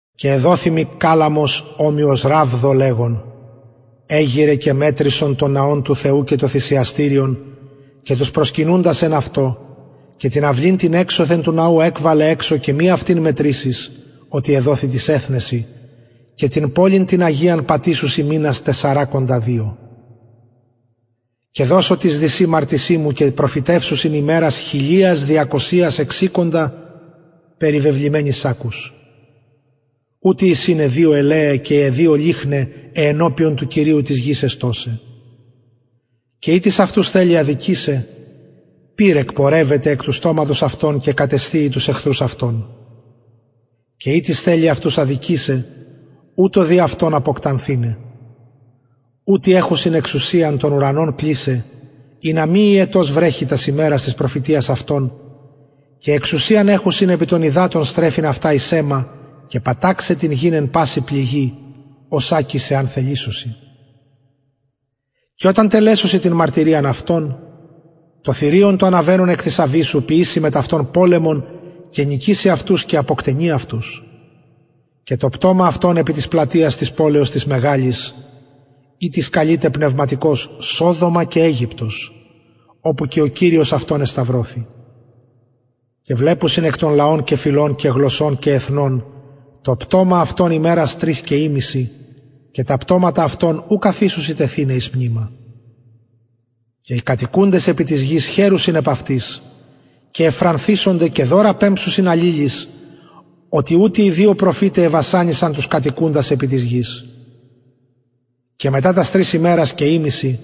και εδοθη μοι καλαμος ομοιος ραβδω λεγων εγειραι και μετρησον τον ναον του θεου και το θυσιαστηριον και τους προσκυνουντας εν αυτω και την αυλην την εξωθεν του ναου εκβαλε εξω και μη αυτην μετρησης οτι εδοθη τοις εθνεσιν και την πολιν την αγιαν πατησουσιν μηνας τεσσαρακοντα και δυο και δωσω τοις δυσιν μαρτυσιν μου και προφητευσουσιν ημερας χιλιας διακοσιας εξηκοντα περιβεβλημενοι σακκους ουτοι εισιν αι δυο ελαιαι και αι δυο λυχνιαι αι ενωπιον του κυριου της γης εστωσαι και ει τις αυτους θελει αδικησαι πυρ εκπορευεται εκ του στοματος αυτων και κατεσθιει τους εχθρους αυτων και ει τις θελει αυτους αδικησαι ουτως δει αυτον αποκτανθηναι ουτοι εχουσιν τον ουρανον εξουσιαν κλεισαι ινα μη υετος βρεχη τας ημερας της προφητειας αυτων και εξουσιαν εχουσιν επι των υδατων στρεφειν αυτα εις αιμα και παταξαι την γην οσακις εαν θελησωσιν εν παση πληγη και οταν τελεσωσιν την μαρτυριαν αυτων το θηριον το αναβαινον εκ της αβυσσου ποιησει μετ αυτων πολεμον και νικησει αυτους και αποκτενει αυτους και το πτωμα αυτων επι της πλατειας της πολεως της μεγαλης ητις καλειται πνευματικως σοδομα και αιγυπτος οπου και ο κυριος αυτων εσταυρωθη και βλεπουσιν εκ των λαων και φυλων και γλωσσων και εθνων το πτωμα αυτων ημερας τρεις ημισυ και τα πτωματα αυτων ουκ αφησουσιν τεθηναι εις μνημα και οι κατοικουντες επι της γης χαιρουσιν επ αυτοις και ευφρανθησονται και δωρα δωσουσιν αλληλοις οτι ουτοι οι δυο προφηται εβασανισαν τους κατοικουντας επι της γης και μετα τας τρεις ημερας και ημισυ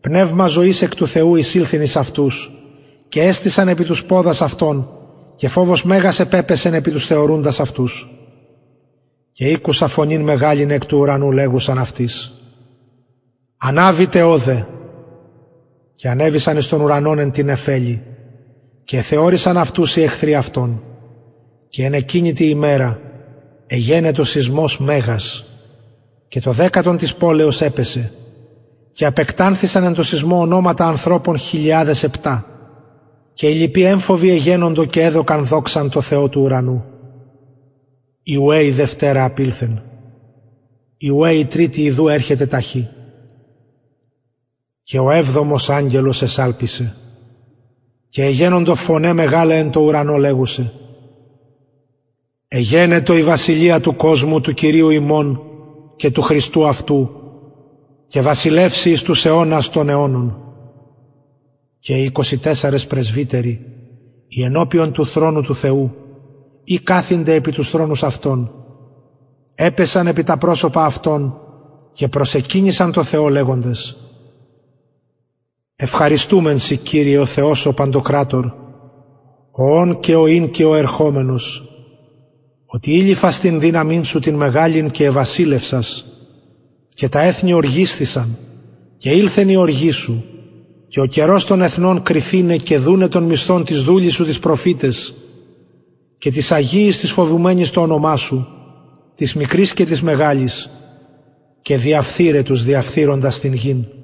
πνευμα ζωης εκ του θεου εισηλθεν εις αυτους και εστησαν επι τους ποδας αυτων και φοβος μεγας επεσεν επι τους θεωρουντας αυτους και ηκουσα φωνην μεγαλην εκ του ουρανου λεγουσαν αυτοις αναβητε ωδε και ανεβησαν εις τον ουρανον εν τη νεφελη και εθεωρησαν αυτους οι εχθροι αυτων και εν εκεινη τη ημερα εγενετο σεισμος μεγας και το δεκατον της πολεως επεσεν και απεκτανθησαν εν τω σεισμω ονοματα ανθρωπων χιλιαδες επτα και οι λοιποι εμφοβοι εγενοντο και εδωκαν δοξαν τω θεω του ουρανου η ουαι η δευτερα απηλθεν η ουαι η τριτη ιδου ερχεται ταχυ και ο εβδομος αγγελος εσαλπισεν και εγενοντο φωναι μεγαλαι εν τω ουρανω λεγουσαι εγενετο η βασιλεια του κοσμου του κυριου ημων και του χριστου αυτου και βασιλευσει εις τους αιωνας των αιωνων και οι εικοσι τεσσαρες πρεσβυτεροι οι ενωπιον του θρονου του θεου καθημενοι επι τους θρονους αυτων επεσον επι τα προσωπα αυτων και προσεκυνησαν τω θεω λεγοντες ευχαριστουμεν σοι κυριε ο θεος ο παντοκρατωρ ο ων και ο ην οτι ειληφας την δυναμιν σου την μεγαλην και εβασιλευσας και τα εθνη ωργισθησαν και ηλθεν η οργη σου και ο καιρος των νεκρων κριθηναι και δουναι τον μισθον τοις δουλοις σου τοις προφηταις και τοις αγιοις και τοις φοβουμενοις το ονομα σου τοις μικροις και τοις μεγαλοις και διαφθειραι τους διαφθειροντας την γην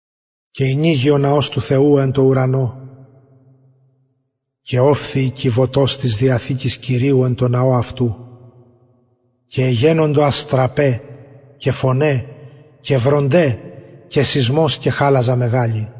και ηνοιγη ο ναος του θεου εν τω ουρανω και ωφθη η κιβωτος της διαθηκης του κυριου εν τω ναω αυτου και εγενοντο αστραπαι και φωναι και βρονται και χαλαζα μεγαλη